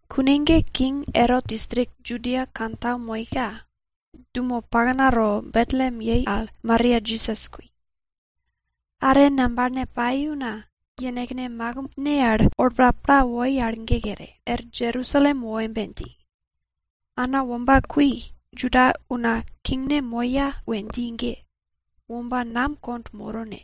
Kune ge king Erot distrik Judia kantau moika, dumo paknato Betlem we dji yei al ge Maria Jisas kui. Are ngambalne pai una yenekne makimbne al olpa pla woi al ge kere, er Jerusalem wo embe dji, ana womba kui Juda una kingne moya we dji ge, womba nam kond moro ne?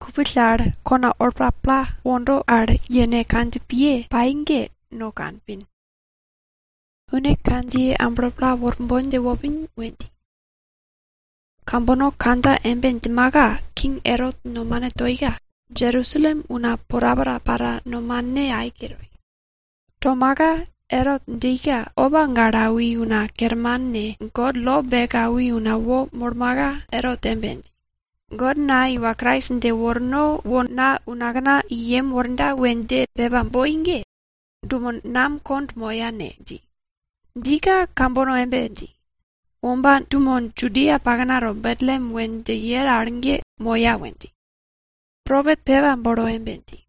Kupill al kona olpa pla wondo al yene kandjipiye pai ge no kanpin. Une kandjiye amblo pla worbon dje wopin we dji. Kambono kandja embe djimaka, king Erot nomane toika, Jerusalem una porapora para nomane aike toi. Tomaka Erot djika opa gale awi una kerman ne, God lo beke awi una wo molmaka, Erot embe dji, God na iwa Krais dje worno wo na unakna i yem worda we dje pepa boi ge, dumo nam kond moya ne? dji. Djika kambono embe dji, womba dumo Judia paknato Betlem we dji yero al ge moya we dji. Propet pepa bolo embe dji,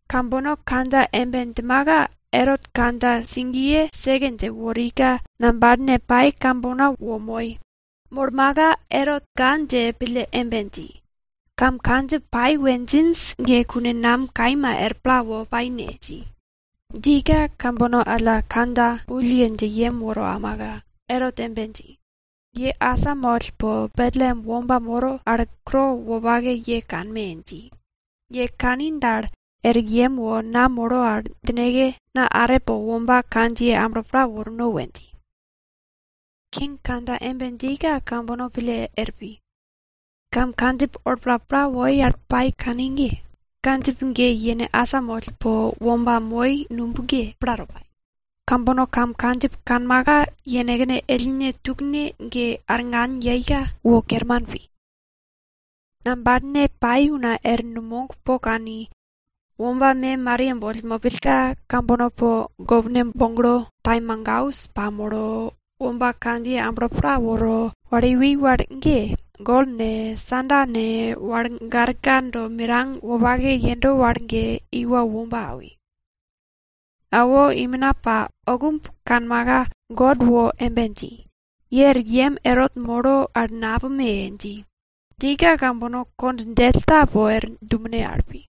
Kambono kandja embe djimaka, Erot kandja sigiye seke dje worika, ngambalne pai kambono wo moi. Molmaka, Erot ga dje pille embe dji, kam kandjip pai we djinj ge kune nam kaima er pla wo pai ne? dji. Djika kambono alla kandja wulle dje yem woro aumaka, Erot embe dji, ye asamoll po Betlem womba moro al kuro wopake ye kanme! dji. Ye kani dal, er yem wo na moro al djineke, na are po womba kandjiye amblo pla worno we dji. King kandja embe djika kambono pille er pi. Kam kandjip olpa pla woi al pai kani ge, kandjip ge yene asamoll po womba moi al numb ge, plato pai. Kambono kam kandjip kanmaka, yenekne ellne tukne ge arngan yeika, wo kerman pi. Ngambalne pai una er numog po kani, womba me Maria boll mopillka, kambono po gopne boglo, taimagaus pamolo, womba kandjiye amblo pla woro, wal iwi wal ge, gol ne, iko nuye mirang wopake yendo wal ne, wal garka do mirang wopake yendo wal ge iwo womba awi. Awo, imina pa oukumb kanmaka, God wo embe dji, ye er yem Erot moro al napume! dji. Djika, kambono kond djell ta po er dumene al pi.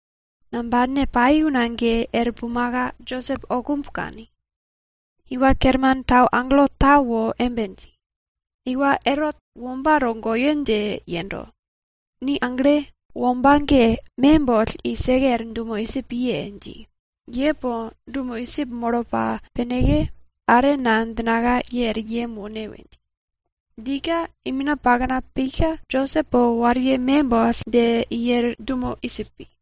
Ngambalne pai una ge er pumaka, Josep oukumb kani. Iwa Kerman tau agelo ta wo embe dji, iwa Erot, womba togoyo dje yendo. Ni agle! Womba ge, me boll i seke er dumo Idjip piye! dji. Ye po dumo Idjip molo pa pineke, are na djinaka, ye er yem wone we dji. Djika imina pakna pika, Josep po wariye me boll dje i er dumo Idjip pi.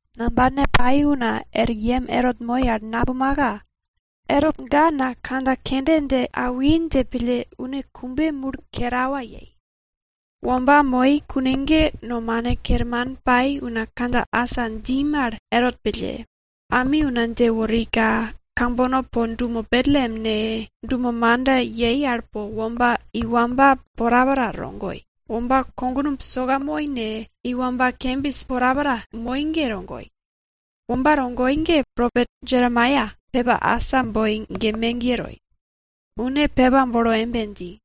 Ngambalne pai una er yem Erot moi al napumaka, Erot ga na kandja kende dje awi dje pille une kumbe mul kerawa yei. Womba moi kune ge nomane kerman pai una kandja asa dji mal Erot pille, ami una dje worika, kambono po dumo Betlem ne, dumo manda yei al po womba iwamba porapora togoi. Womba kognumb soka moi ne, iwamba kembis porapora moi ge togoi. Womba togoi ge propet Jeremaia pepa asa boi ge megiye toi. Une pepa bolo embe dji,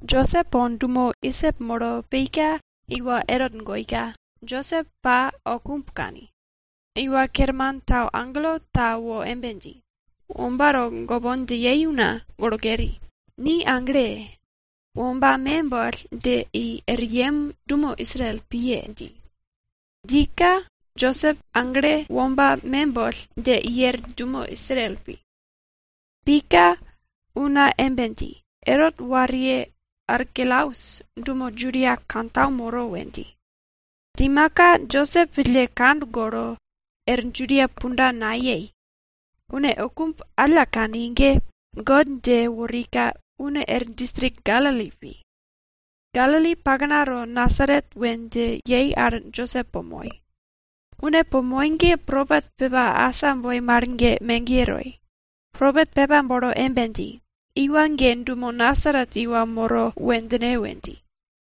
Josep po dumo Idjip molo pika iwa Erot goika, Josep pa oukumb kani. Iwa Kerman tau agelo ta wo embe dji, womba togopon dje yei una, golo keri. Ni agle! womba me boll dje i er yem dumo Israel piye! dji. Djika Josep aglo womba me boll dje i er dumo Israel pi. Pika una embe dji, Erot wariye Arkelaus dumo Judia kantau moro we dji. Djimaka, Josep pille kand golo er Judia punda nayei. Une oukumb alla kani ge, God dje worika, une er distrik Galili pi. Galili paknato Nasaret we dji yei al Josep po moi. Une po moi ge propet pepa asa boi mal ge megiye toi. Propet pepa bolo embe dji, iwa ge dumo Nasaret iwa moro, we djine we dji.